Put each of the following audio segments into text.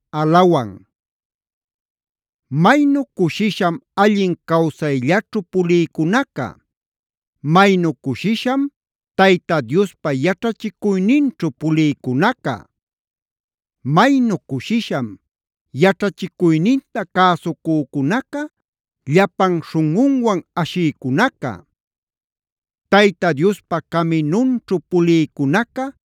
Alef Maynu cushisham allin cawsayllaćhu pulïcunaca. Maynu cushisham Tayta Diospa yaćhachicuyninćhu pulïcunaca. Maynu cushisham yaćhachicuyninta cäsucücunaca, llapan śhunꞌunwan ashïcunaca. Tayta Diospa caminunćhu pulïcunaca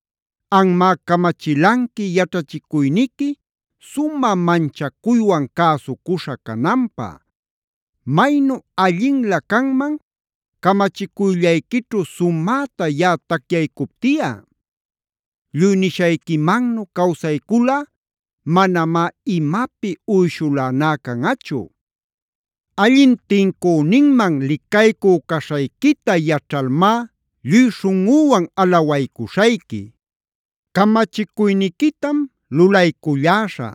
Anmá camachilanqui yaćhachicuyniqui, sumä manchacuywan cäsucuśha cananpä. Maynu allinlä canman camachicuyllayquićhu sumäta yaꞌa tacyaycuptiꞌa. Lluy nishayquimannu cawsayculꞌa manamá imapi uyshuläná canꞌachu. Allin tincüninman licaycü caśhayquita yaćhalmá lluy śhunꞌüwan alawaycuśhayqui. ¡Camachicuyniquitam lulayculläśhä!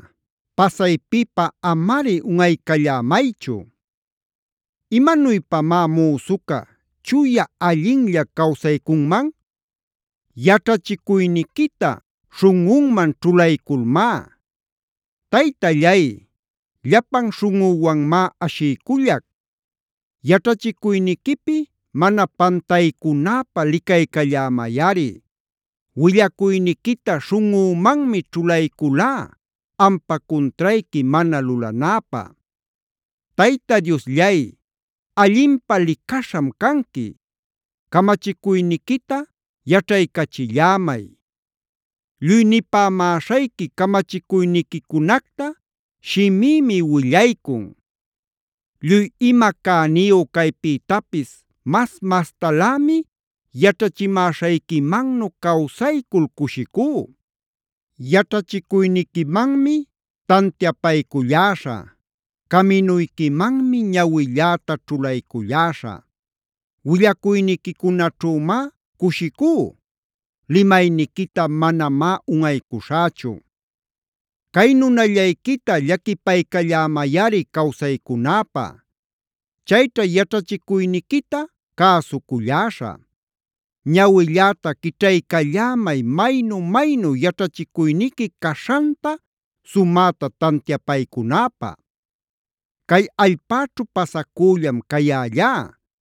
¡Pasaypipä amari unꞌaycallämaychu! ¿Imanuypamá müsuca chuya allinlla cawsaycunman? Yaćhachicuyniquita śhunꞌunman ćhulayculmá. Taytallay, llapan śhunꞌüwanmá ashiycullac. Yaćhachicuyniquipi mana pantaycunäpä licaycallämayꞌari. Willacuyniquita śhunꞌümanmi ćhulayculá ampa cuntrayqui mana lulanäpä. ¡Tayta Diosllay, allinpä licaśham canqui! Camachicuyniquita yaćhaycachillämay. Lluy nipämäśhayqui camachicuyniquicunacta shimïmi willaycun. Lluy ima cäniyu caypïtapis mas-mastalämi yaćhachimäśhayquimannu cawsaycul cushicú. Yaćhachicuyniquimanmi tantiapayculläśhä. Caminuyquimanmi ñawilläta ćhulayculläśhä. Willacuyniquicunaćhümá cushicú. Limayniquita manamá unꞌaycuśhächu. Cay nunallayquita llaquipaycallämayꞌari cawsaycunäpä. Chayćha yaćhachicuyniquita cäsulläśhä. Ñawilläta quićhaycallämay maynu-maynu yaćhachicuyniqui caśhanta sumäta tantiapaycunäpä. Cay allpäćhu pasacüllam cayällá.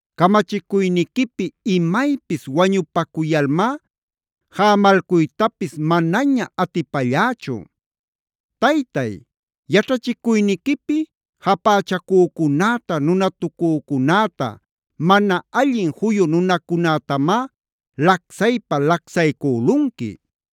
Camachicuyniquipi imaypis wañupacuyalmá jämalcuytapis manaña atipällächu. Taytay, yaćhachicuyniquipi japächacücunäta, nunatucücunäta, mana allin juyu nunacunätamá lacsaypa-lacsaycülunqui.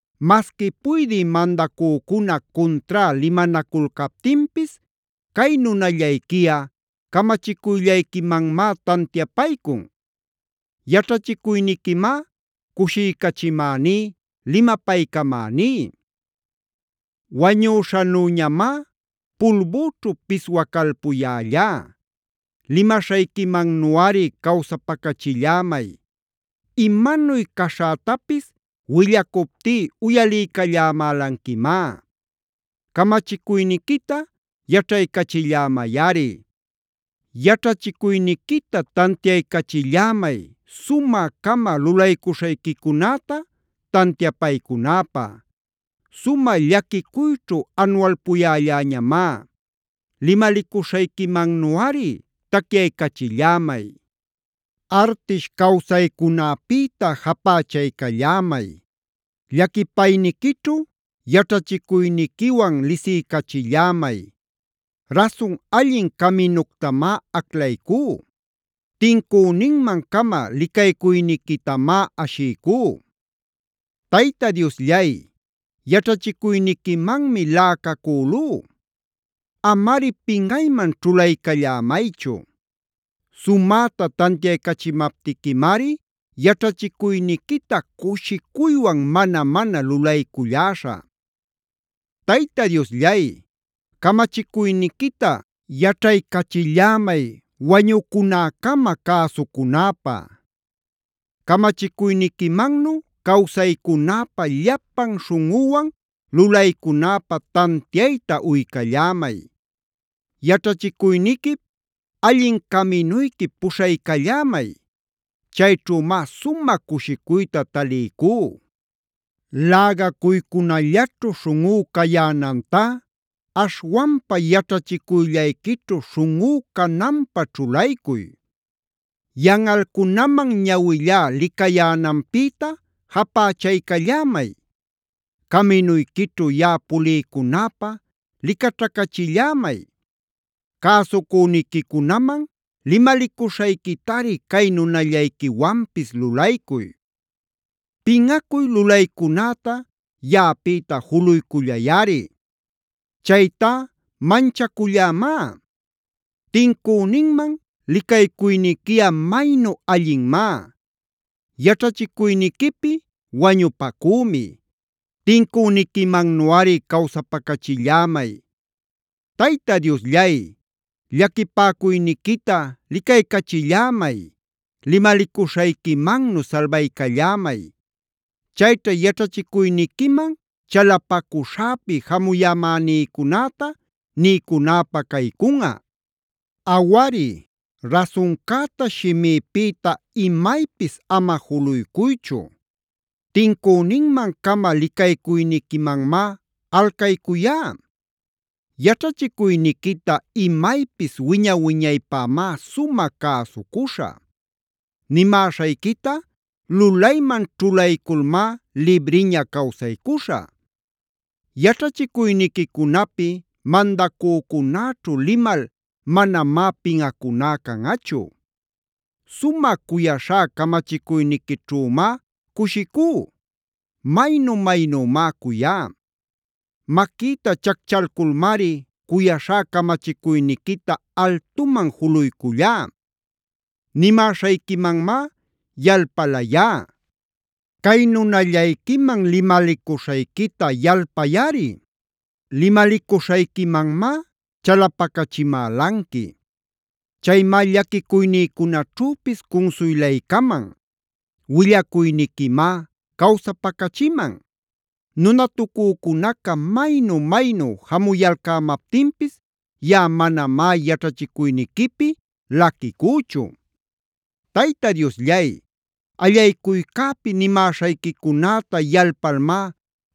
Masqui puydï mandacücuna cuntrá limanaculcaptinpis cay nunallayquiꞌa camachicuyllayquimanmá tantiapaycun. Yaćhachicuyniquimá cushiycachimäní, limapaycamäní. Wañüśhanüñamá pulbüćhu piswacalpuyällá. Limaśhayquimannuꞌari cawsapacachillämay. Imanuy caśhätapis willacuptí uyaliycallämälanquimá. Camachicuyniquita yaćhaycachillämayꞌari. Yaćhachicuyniquita tantiaycachillämay sumä-cama lulaycuśhayquicunäta tantiapaycunäpä. Sumä llaquicuyćhu anualpuyälläñamá. Limalicuśhayquimannuꞌari tacyaycachillämay. Artish cawsaycunäpïta japächaycallämay. Llaquipayniquićhu yaćhachicuyniquiwan lisiycachillämay. Rasun allin caminuctamá aclaycú. Tincüninman-cama licaycuyniquitamá ashiycú. Tayta Diosllay, yaćhachicuyniquimanmi laꞌacacülú. Amari pinꞌayman ćhulaycallämaychu. Sumäta tantiaycachimaptiquimari yaćhachicuyniquita cushicuywan mana-mana lulayculläśhä. Tayta Diosllay, camachicuyniquita yaćhaycachillämay wañucunäcama cäsucunäpä. Camachicuyniquimannu cawsaycunäpä, llapan śhunꞌüwan lulaycunäpä tantiayta uycallämay. Yaćhachicuyniquip, allin caminuyquip puśhaycallämay. Chayćhümá sumä cushicuyta taliycú. Lägacuycunällaćhu śhunꞌú cayänantá aśhwanpa yaćhachicuyllayquićhu śhunꞌú cananpä ćhulaycuy. Yanꞌalcunaman ñawillá licayänanpïta japächaycallämay. Caminuyquićhu yaꞌa puliycunäpä licaćhacachillämay. Cäsucüniquicunaman limalicuśhayquitari cay nunallayquiwanpis lulaycuy. Pinꞌacuy lulaycunäta yaꞌapïta juluycullayꞌari. Chaytá manchacullämá. Tincüninman licaycuyniquiꞌa maynu allinmá. Yaćhachicuyniquipi wañupacümi. Tincüniquimannuꞌari cawsapacachillämay. Tayta Diosllay, llaquipäcuyniquita licaycachillämay. Limalicuśhayquimannu salbaycallämay. Chayćhá yaćhachicuyniquiman chalapacuśhäpi jamuyämänïcunäta niycunäpä caycunꞌa. Awari, rasuncäta shimïpïta imaypis ama juluycuychu. Tincüninman-cama licaycuyniquimanmá alcaycuyá. Yaćhachicuyniquita imaypis wiña-wiñaypämá sumä cäsucuśhä. Nimäśhayquita lulayman ćhulayculmá libriña cawsaycuśhä. Yaćhachicuyniquicunapi mandacücunäćhu limal manamá pinꞌacuná canꞌachu. Sumä cuyaśhá camachicuyniquićhümá cushicú. Maynu-maynümá cuyá. Maquïta chacchalculmari cuyaśhá camachicuyniquita altuman juluycullá. Nimäśhayquimanmá yalpalayá. Cay nunallayquiman limalicuśhayquita yalpayꞌari. Limalicuśhayquimanmá chalapacachimälanqui. Chaymá llaquicuynïcunaćhüpis cunsuylaycaman. Willacuyniquimá cawsapacachiman. Nunatucücunaca maynu-maynu jamuyayalcämaptinpis yaꞌa manamá yaćhachicuyniquipi laquicüchu. Tayta Diosllay, allaycuycäpi nimäśhayquicunäta yalpalmá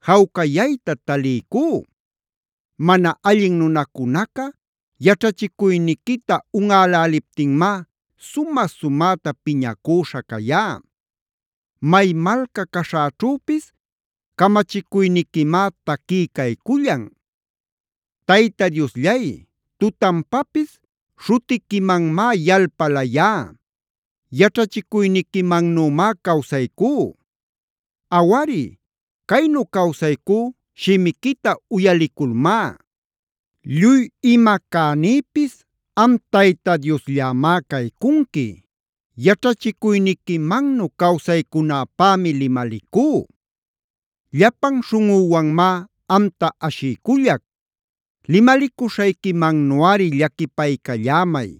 jawcayayta taliycú. Mana allin nunacunaca yaćhachicuyniquita unꞌäläliptinmá sumä-sumäta piñacüśha cayá. May malca caśhäćhüpis, camachicuyniquimá taquí caycullan. Tayta Diosllay, tutanpapis śhutiquimanmá yalpalayá. Yaćhachicuyniquimannümá cawsaycú. Awari, caynu cawsaycú, shimiquita uyaliculmá. Lluy ima cänïpis am Tayta Diosllämá caycunqui. Yaćhachicuyniquimannu cawsaycunäpämi limalicú. Llapan śhunꞌüwanmá amta ashiycullac. Limalicuśhayquimannuꞌari llaquipaycallämay.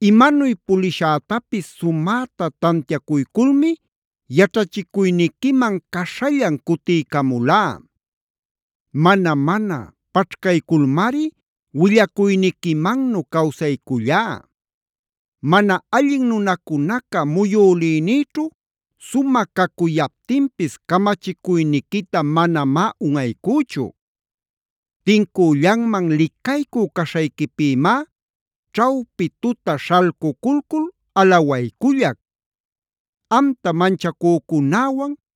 Imanuy pulishätapis sumäta tantiacuyculmi yaćhachicuyniquiman caśhallan cutiycamulá. Mana-manac paćhcayculmari willacuyniquimannu cawsaycullá. Mana allin nunacunaca muyülïnïćhu sumä cacuyaptinpis camachicuyniquita manamá unꞌaycüchu. Tincüllanman licaycü caśhayquipïmá ćhawpi tuta śhalcuculcul alawaycullac. Amta manchacücunäwan,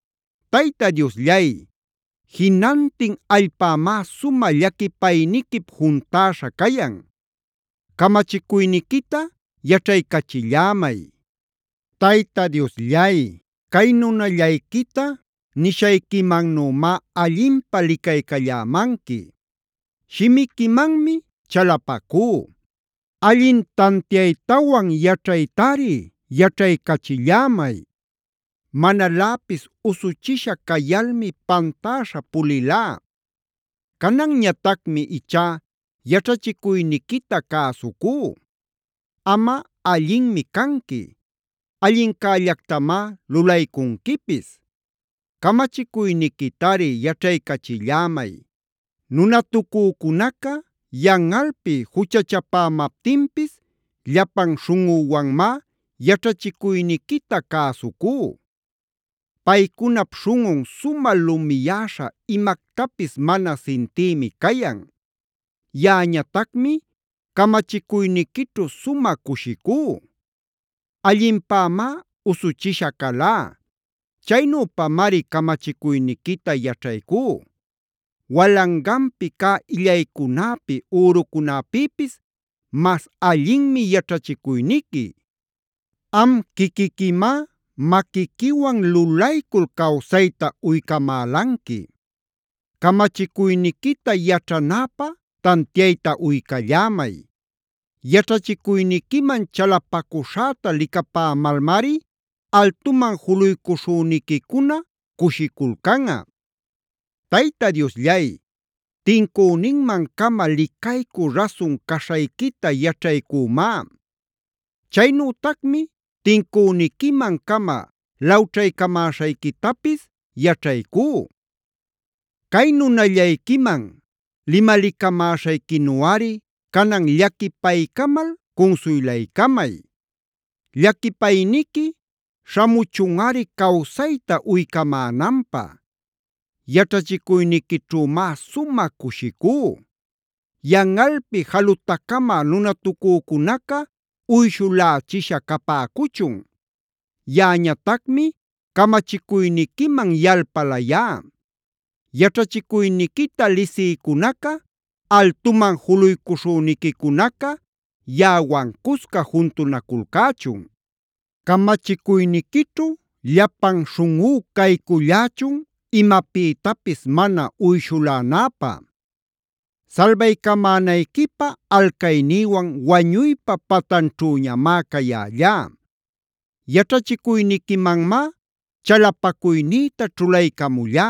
Tayta Diosllay, jinantin allpämá sumä llaquipayniquip juntäśha cayan.e Camachicuyniquita yaćhaycachillämay. Tayta Diosllay, cay nunallayquita nishayquimannümá allinpä licaycallämanqui. Shimiquimanmi chalapacú. Allin tantiaytawan yaćhaytari yaćhaycachillämay. Manaläpis usuchisha cayalmi pantäśha pulilá. Cananñatacmi ichá yaćhachicuyniquita cäsucú. Amꞌa allinmi canqui. Allincällactamá lulaycunquipis. Camachicuyniquitari yaćhaycachillämay. Nunatucücunaca yanꞌalpi juchachapämaptinpis llapan śhunꞌüwanmá yaćhachicuyniquita cäsucú. Paycunap śhunꞌun sumä lumiyäśha imactapis mana sintïmi cayan. Yaꞌañatacmi camachicuyniquićhu sumä cushicú. Allinpämá usuchisha calá. Chaynüpamari camachicuyniquita yaćhaycú. Walanganpi cä illaycunäpi, ürucunäpïpis mas allinmi yaćhachicuyniqui. Am quiquiquimá maquiquiwan lulaycul cawsayta uycamälanqui. Camachicuyniquita yaćhanäpä tantiayta uycallämay. Yaćhachicuyniquiman chalapacuśhäta licapämalmari altuman juluycuśhüniquicuna cushiculcanꞌa. Tayta Diosllay, tincüninman-cama licaycü rasun caśhayquita yaćhaycümá. Chaynütacmi tincüniquiman-cama lawćhaycamäśhayquitapis yaćhaycú. Cay nunallayquiman limalicamäśhayquinuꞌari canan llaquipaycamal cunsuylaycamay. Llaquipayniqui śhamuchunꞌari cawsayta uycamänanpä. Yaćhachicuyniquićhümá sumä cushicú. Yanꞌalpi jalutacamä nunatucücunaca uyshulächisha capäcuchun. Yaꞌañatacmi camachicuyniquiman yalpalayá. Yaćhachicuyniquita lisïcunaca, altuman juluycuśhüniquicunaca yaꞌawan cusca juntunaculcächun. Camachicuyniquićhu llapan śhunꞌú caycullächun imapïtapis mana uyshulänäpä. Salbaycamänayquipä alcaynïwan wañuypa patanćhüñamá cayällá. Yaćhachicuyniquimanmá chalapacuynïta ćhulaycamullá: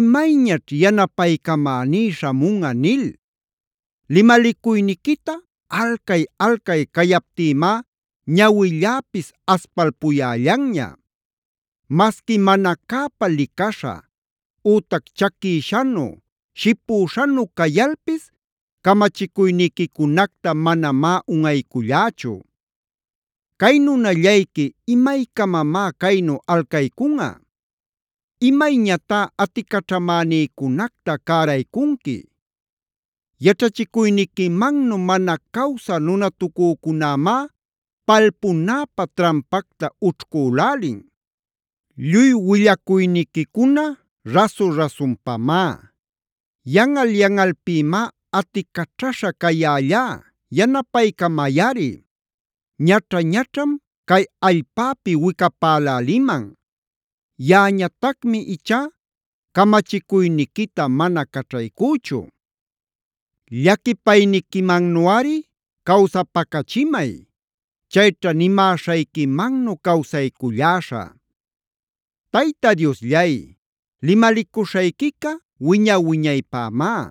“¿Imayñaćh yanapaycamäní śhamunꞌa?” nil limalicuyniquita alcay-alcay cayaptïmá ñawilläpis aspalpuyällanña. Masqui mana cäpa licaśha, ütac chaquïshanu, shipüśhanu cayalpis camachicuyniquicunacta manamá unꞌaycullächu. Cay nunallayqui ¿imaycamamá caynu alcaycunꞌa? ¿Imayñatá aticaćhamänïcunacta cäraycunqui? Yaćhachicuyniquimannu mana cawsä nunatucücunämá palpunäpä trampacta ućhcülälin. Lluy willacuyniquicuna rasu-rasunpamá. Yanꞌal-yanꞌalpïmá aticaćhaśha cayällá, yanapaycamayꞌari. Ñaćha-ñaćham cay allpäpi wicapäläliman. Yaꞌañatacmi ichá camachicuyniquita mana caćhaycüchu. Llaquipayniquimannuꞌari cawsapacachimay. Chayćha nimäśhayquimannu cawsayculläśhä. Tayta Diosllay, limalicuśhayquica wiña-wiñaypämá.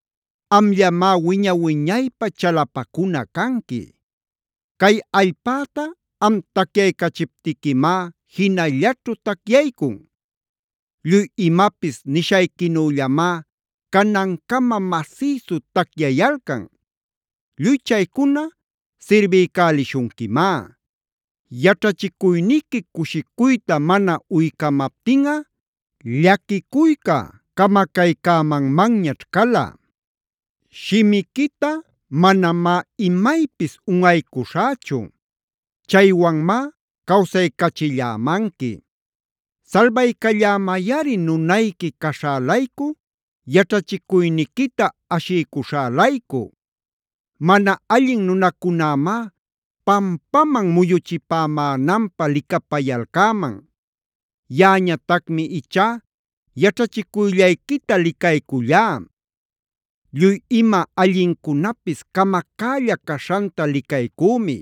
Amllamá wiña-wiñaypä chalapacuna canqui. Cay allpäta am tacyaycachiptiquimá jinallaćhu tacyaycun. Lluy imapis nishayquinüllamá canancama masïsu tacyayalcan. Lluy chaycuna sirbiycälishunquimá. Yaćhachicuyniqui cushicuyta mana uycamaptinꞌa llaquicuyca camacaycämanmanñaćh cala. Shimiquita manamá imaypis unꞌaycuśhächu. Chaywanmá cawsaycachillämanqui. Salbaycallämayꞌari nunayqui caśhä-laycu, yaćhachicuyniquita ashiycuśhä-laycu. Mana allin nunacunämá pampaman muyuchipämänanpä licapayalcäman. Yaꞌañatacmi ichá yaćhachicuyllayquita licaycullá. Lluy ima allincunapis camacälla caśhanta licaycümi.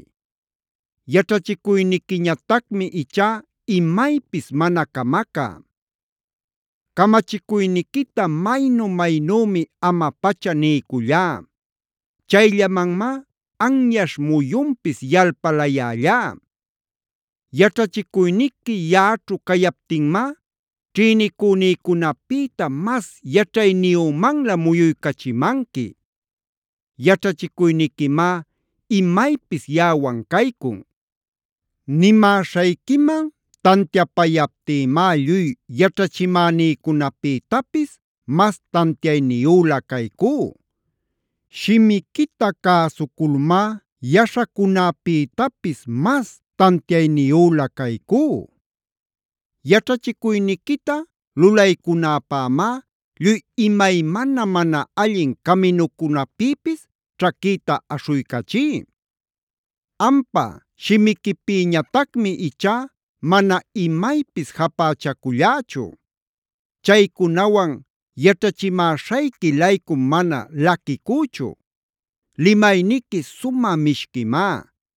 Yaćhachicuyniquiñatacmi ichá imaypis mana camacä. Camachicuyniquita maynu-maynümi ama-pacha niycullá. Chayllamanmá anyaśh muyunpis yalpalayällá. Yaćhachicuyniqui yaꞌaćhu cayaptinmá ćhïnicünïcunapïta mas yaćhayniyümanlä muyuycachimanqui. Yaćhachicuyniquimá imaypis yaꞌawan caycun. Nimäśhayquiman tantiapayaptïmá lluy yaćhachimänïcunapïtapis mas tantiayniyülä caycú. Shimiquita cäsuculmá yaśhacunäpïtapisg mas tantiayniyülä caycú. Yaćhachicuyniquita lulaycunäpämá lluy imaymana mana allin caminucunapïpis ćhaquïta aśhuycachí. Ampa shimiquipïñatacmi ichá mana imaypis japächacullächu. Chaycunawan yaćhachimäśhayqui-laycum mana laquicüchu. Limayniqui sumä mishquimá.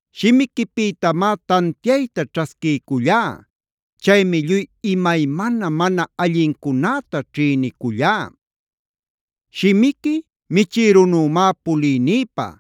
Shimiquipïtamá tantiayta ćhasquiycullá. Chaymi lluy imaymana mana allincunätá ćhïnicullá. Shimiqui michïrunümá puliynïpä,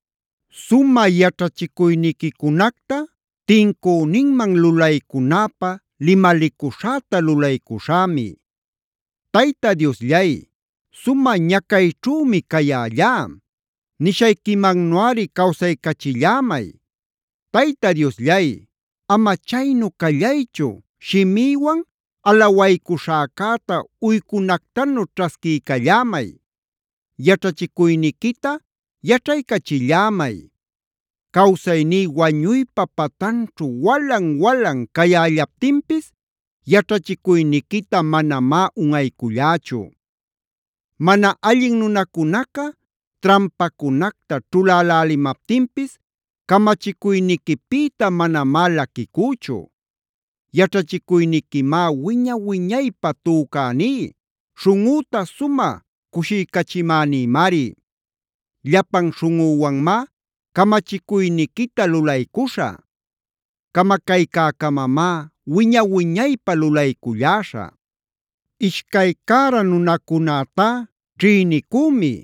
Sumä yaćhachicuyniquicunacta tincüninman lulaycunäpä limalicuśhäta lulaycuśhämi. Tayta Diosllay, sumä ñacayćhümi cayällá. Nishayquimannuꞌari cawsaycachillämay. Tayta Diosllay, ama chaynu callaychu shimïwan alawaycuśhäcäta uycunactanu ćhasquiycallämay. Yaćhachicuyniquita yaćhaycachillämay. Cawsayní wañuypa patanćhu walan-walan cayällaptinpis yaćhachicuyniquita manamá unꞌaycullächu. Mana allin nunacunaca trampacunacta ćhulälälimaptinpis camachicuyniquipïta manamá laquicüchu. Yaćhachicuyniquimá wiña-wiñaypä tücäní, śhunꞌüta sumä cushiycachimänïmari. Llapan śhunꞌüwanmá camachicuyniquita lulaycuśhä. Camacaycäcamamá wiña-wiñaypä lulayculläśhä. Ishcay cära nunacunätá ćhïnicümi.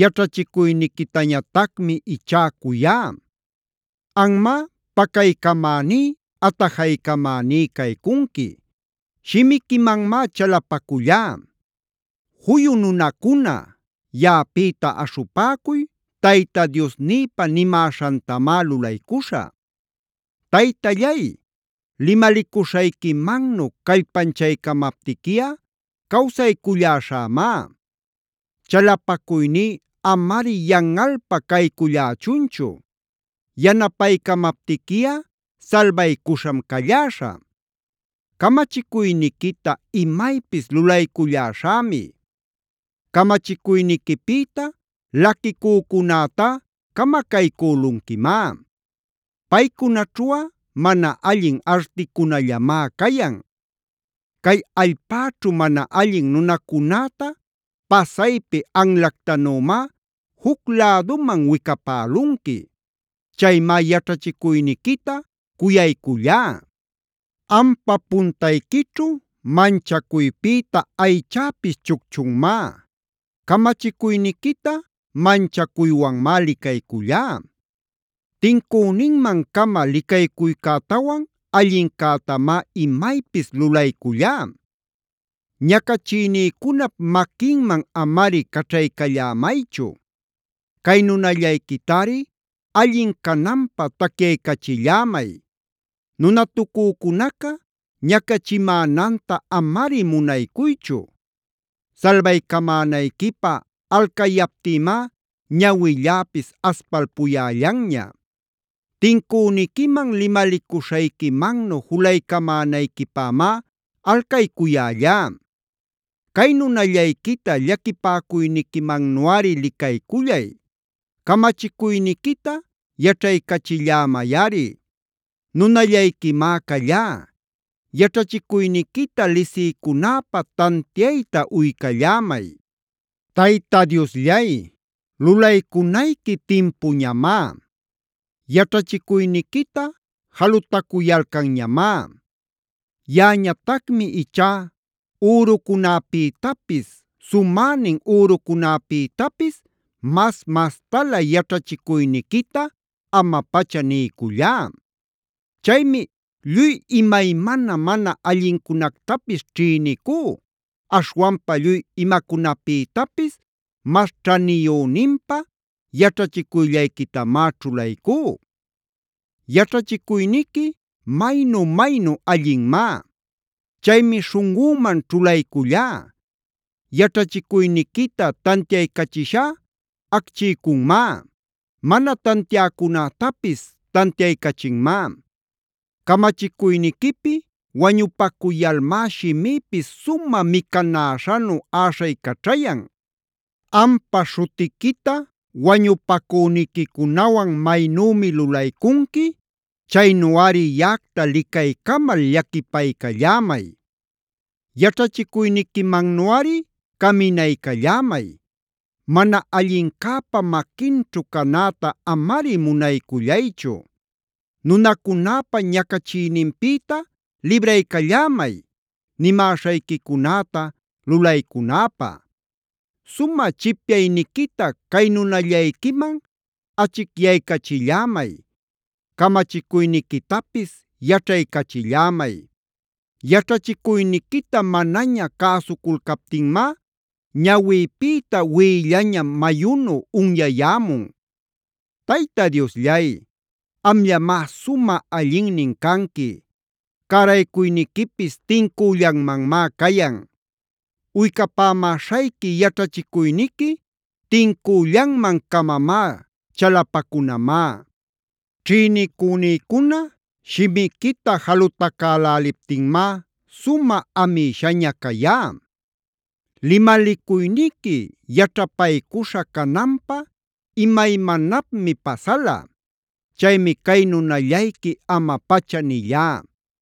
Yaćhachicuyniquitañatacmi ichá cuyá. Anmá pacaycamäní, atajaycamäní caycunqui. Shimiquimanmá chalapacullá. Juyu nunacuna, yaꞌapïta aśhupäcuy Tayta Diosnïpa nimäśhantamá lulaycuśhä. Taytallay, limalicuśhayquimannu callpanchaycamaptiquiꞌa cawsayculläśhämá. Chalapacuyní amari yanꞌalpa caycullächunchu. Yanapaycamaptiquiꞌa salbaycuśham calläśhä. Camachicuyniquita imaypis lulayculläśhämi. Camachicuyniquipïta laquicücunätá camacaycülunquimá. Paycunaćhuꞌa mana allin articunallamá cayan. Cay allpäćhu mana allin nunacunäta pasaypi anlactanümá juc läduman wicapälunqui. Chaymá yaćhachicuyniquita cuyaycullá. Ampa puntayquićhu manchacuypïta aychäpis chucchunmá. Camachicuyniquita manchacuywanmá licaycullá. Tincüninman-cama licaycuycätawan allincätamá imaypis lulaycullá. Ñacachïnïcunap maquinman amari caćhaycallämaychu. Cay nunallayquitari allin cananpä tacyaycachillämay. Nunatucücunaca ñacachimänanta amari munaycuychu. Salbaycamänayquipä alcayaptïmá ñawilläpis aspalpuyällanña. Tincüniquiman limalicuśhayquimannu julaycamänayquipämá alcaycuyällá. Cay nunallayquita llaquipäcuyniquimannuꞌari licaycullay. Camachicuyniquita yaćhaycachillämayꞌari. Nunallayquimá callá; yaćhachicuyniquita lisiycunäpä tantiayta uycallämay. Tayta Diosllay, lulaycunayqui timpuñamá. Yaćhachicuyniquita jalutacuyalcanñamá. Yaꞌañatacmi ichá ürucunäpïtapis, sumänin ürucunäpïtapis mas-mastalä yaćhachicuyniquita ama-pacha niycullá. Chaymi lluy imaymana mana allincunactapis ćhïnicú, aśhwanpa lluy imacunapïtapis mas ćhaniyüninpä yaćhachicuyllayquitamá ćhulaycú. Yaćhachicuyniqui maynu-maynu allinmá. Chaymi śhunꞌüman ćhulaycullá. Yaćhachicuyniquita tantiaycachishá acchiycunmá. Mana tantiäcunätapis tantiaycachinmá. Camachicuyniquipi wañupacuyalmá shimïpis sumä micanäśhanu äśhaycaćhayan. Ampa śhutiquita wañupacüniquicunawan maynümi lulaycunqui, chaynuꞌari yaꞌacta licaycamal llaquipaycallämay. Yaćhachicuyniquimannuꞌari caminaycallämay. Mana allincäpa maquinćhu canäta amari munaycullaychu. Nunacunäpa ñacachiyninpïta libraycallämay nimäśhayquicunäta lulaycunäpä. Sumä chipyayniquita cay nunallayquiman achicyaycachillämay. Camachicuyniquitapis yaćhaycachillämay. Yaćhachicuyniquita manaña cäsuculcaptinmá ñawïpïta wiꞌillaña mayunu unyayämun. Tayta Diosllay, amllamá sumä allinnin canqui. Cäraycuyniquipis tincüllanmanmá cayan. Uycapämäśhayqui yaćhachicuyniqui tincüllanman-camamá, chalapacunamá. Ćhïnicünïcuna shimiquita jalutacäläliptinmá sumä amïshaña cayá. Limalicuyniqui yaćhapaycuśha cananpä imaymanapmi pasala. Chaymi cay nunallayqui ama-pacha nillá.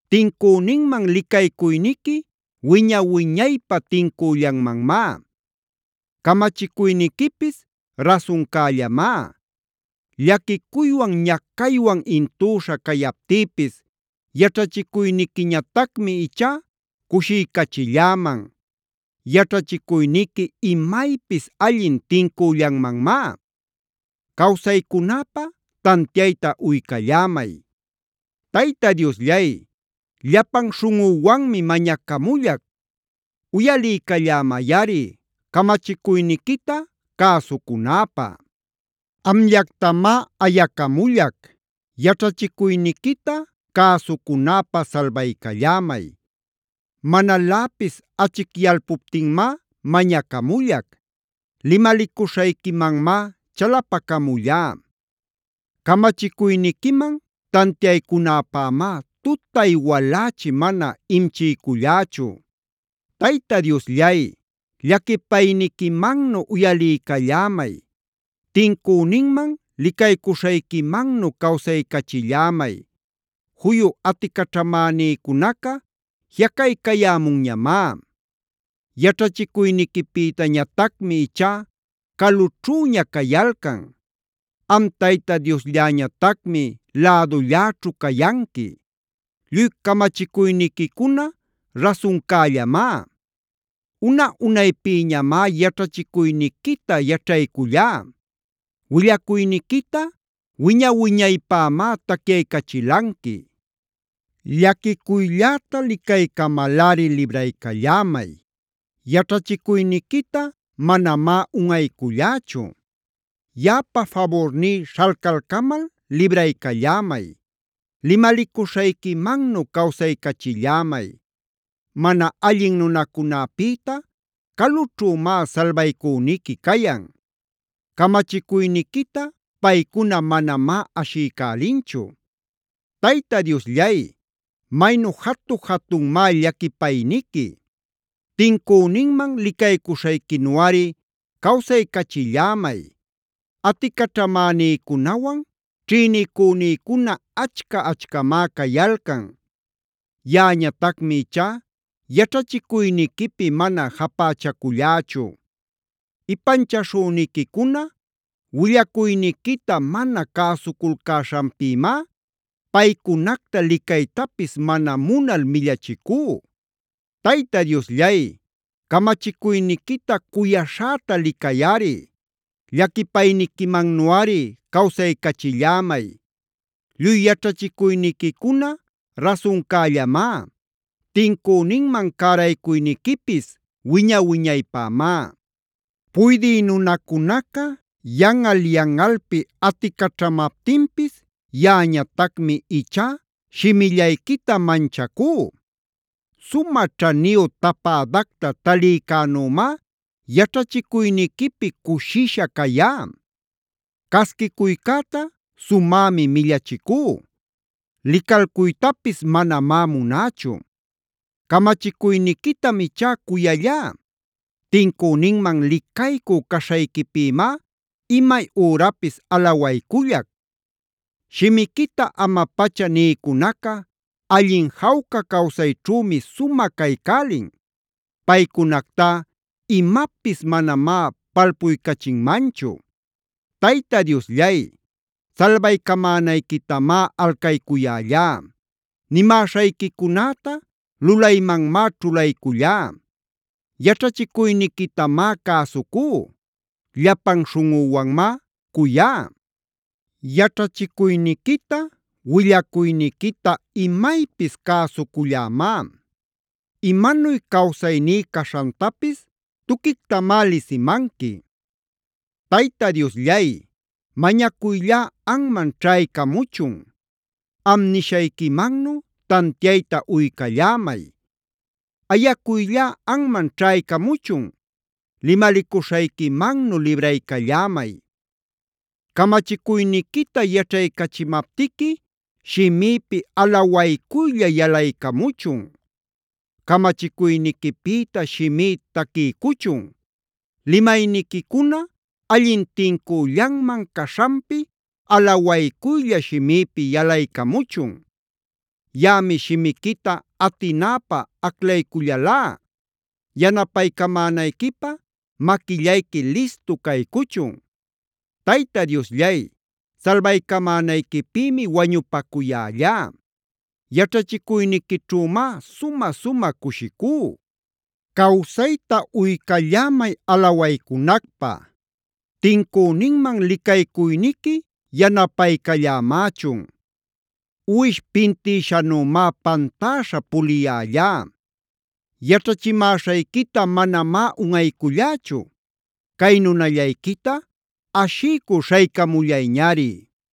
Tincüninman licaycuyniqui wiña-wiñaypä tincüllanmanmá. Camachicuyniquipis rasuncällamá. Llaquicuywan ñacaywan intüśha cayaptïpis yaćhachicuyniquiñatacmi ichá cushiycachilläman. Yaćhachicuyniqui imaypis allin tincüllanmanmá. Cawsaycunäpä tantiayta uycallämay. Tayta Diosllay, llapan śhunꞌüwanmi mañacamullac. Uyaliycallämayꞌari camachicuyniquita cäsucunäpä. Amllactamá ayacamullac. Yaćhachicuyniquita cäsucunäpä salbaycallämay. Manaläpis achicyalpuptinmá mañacamullac. Limalicuśhayquimanmá chalapacamullá. Camachicuyniquiman tantiaycunäpämá tutay walächi mana imchiycullächu. Tayta Diosllay, llaquipayniquimannu uyaliycallämay. Tincüninman licaycuśhayquimannu cawsaycachillämay. Juyu aticaćhamänïcunaca jiꞌacaycayämunñamá. Yaćhachicuyniquipïtañatacmi ichá calućhüña cayalcan. Am Tayta Dioslläñatacmi lädulläćhu cayanqui. Lluy camachicuyniquicuna rasuncällamá. Una-unaypïñamá yaćhachicuyniquita yaćhaycullá. Willacuyniquita wiña-wiñaypämá tacyaycachilanqui. Llaquicuylläta licaycamalꞌari libraycallämay. Yaćhachicuyniquita manamá unꞌaycullächu. Yaꞌapa faburní śhalcalcamal libraycallämay. Limalicuśhayquimannu cawsaycachillämay. Mana allin nunacunäpïta calućhümá salbacuyniqui cayan. Camachicuyniquita paycuna manamá ashiycälinchu. Tayta Diosllay, maynu jatu-jatunmá llaquipayniqui. Tincüninman licaycuśhayquinuꞌari cawsaycachillämay. Aticaćhamänïcunawan ćhïnicünïcuna achca-achcamá cayalcan. Yaꞌañatacmi ichá yaćhachicuyniquipi mana japächacullächu. Ipanchaśhüniquicuna willacuyniquita mana cäsuculcäśhanpïmá paycunacta licaytapis mana munal millachicú. Tayta Diosllay, camachicuyniquita cuyaśhäta licayꞌari. Llaquipayniquimannuꞌari cawsaycachillämay. Lluy yaćhachicuyniquicuna rasuncällamá. Tincüninman cäraycuyniquipis wiña-wiñaypämá. Puydï nunacunaca yanꞌal-yanꞌalpi aticaćhamaptinpis yaꞌañatacmi ichá shimillayquita manchacú. Sumä ćhaniyu tapädacta talïcänümá yaćhachicuyniquipi cushisha cayá. Casquicuycäta sumämi millachicú. Licalcuytapis manamá munächu. Camachicuyniquitam ichá cuyallá. Tincüninman licaycü caśhayquipïmá imay ürapis alawaycullac. Shimiquita ama-pacha nïcunaca allin jawca cawsayćhümi sumä caycälin. Paycunactá imapis manamá palpuycachinmanchu. Tayta Diosllay, salbaycamänayquitamá alcaycuyällá. Nimäśhayquicunäta lulaymanmá ćhulaycullá. Yaćhachicuyniquitamá cäsucú. Llapan śhunꞌüwanmá cuyá. Yaćhachicuyniquita willacuyniquita imaypis cäsucullämá. Imanuy cawsayní caśhantapis tuquictamá lisimanqui. Tayta Diosllay, mañacuyllá anman ćhaycamuchun. Am nishayquimannu tantiayta uycallämay. Ayacuyllá anman ćhaycamuchun. Limalicuśhayquimannu libraycallämay. Camachicuyniquita yaćhaycachimaptiqui shimïpi alawaycuylla yalaycamuchun. Camachicuyniquipïta shimí taquiycuchun. Limayniquicuna allin tincüllanman caśhanpi alawaycuylla shimïpi yalaycamuchun. Yaꞌami shimiquita atinäpä aclaycullälá. Yanapaycamänayquipä maquillayqui listu caycuchun. Tayta Diosllay, salbaycamänayquipïmi wañupacuyällá. Yaćhachicuyniquićhümá sumä-sumä cushicú. Cawsayta uycallämay alawaycunacpä. Tincüninman licaycuyniqui yanapaycallämächun. Uwish pintïshanümá pantäśha puliyällá.j Yaćhachimäśhayquita manamá unꞌaycullächu. Cay nunallayquita ashiycü śhaycamullayñari.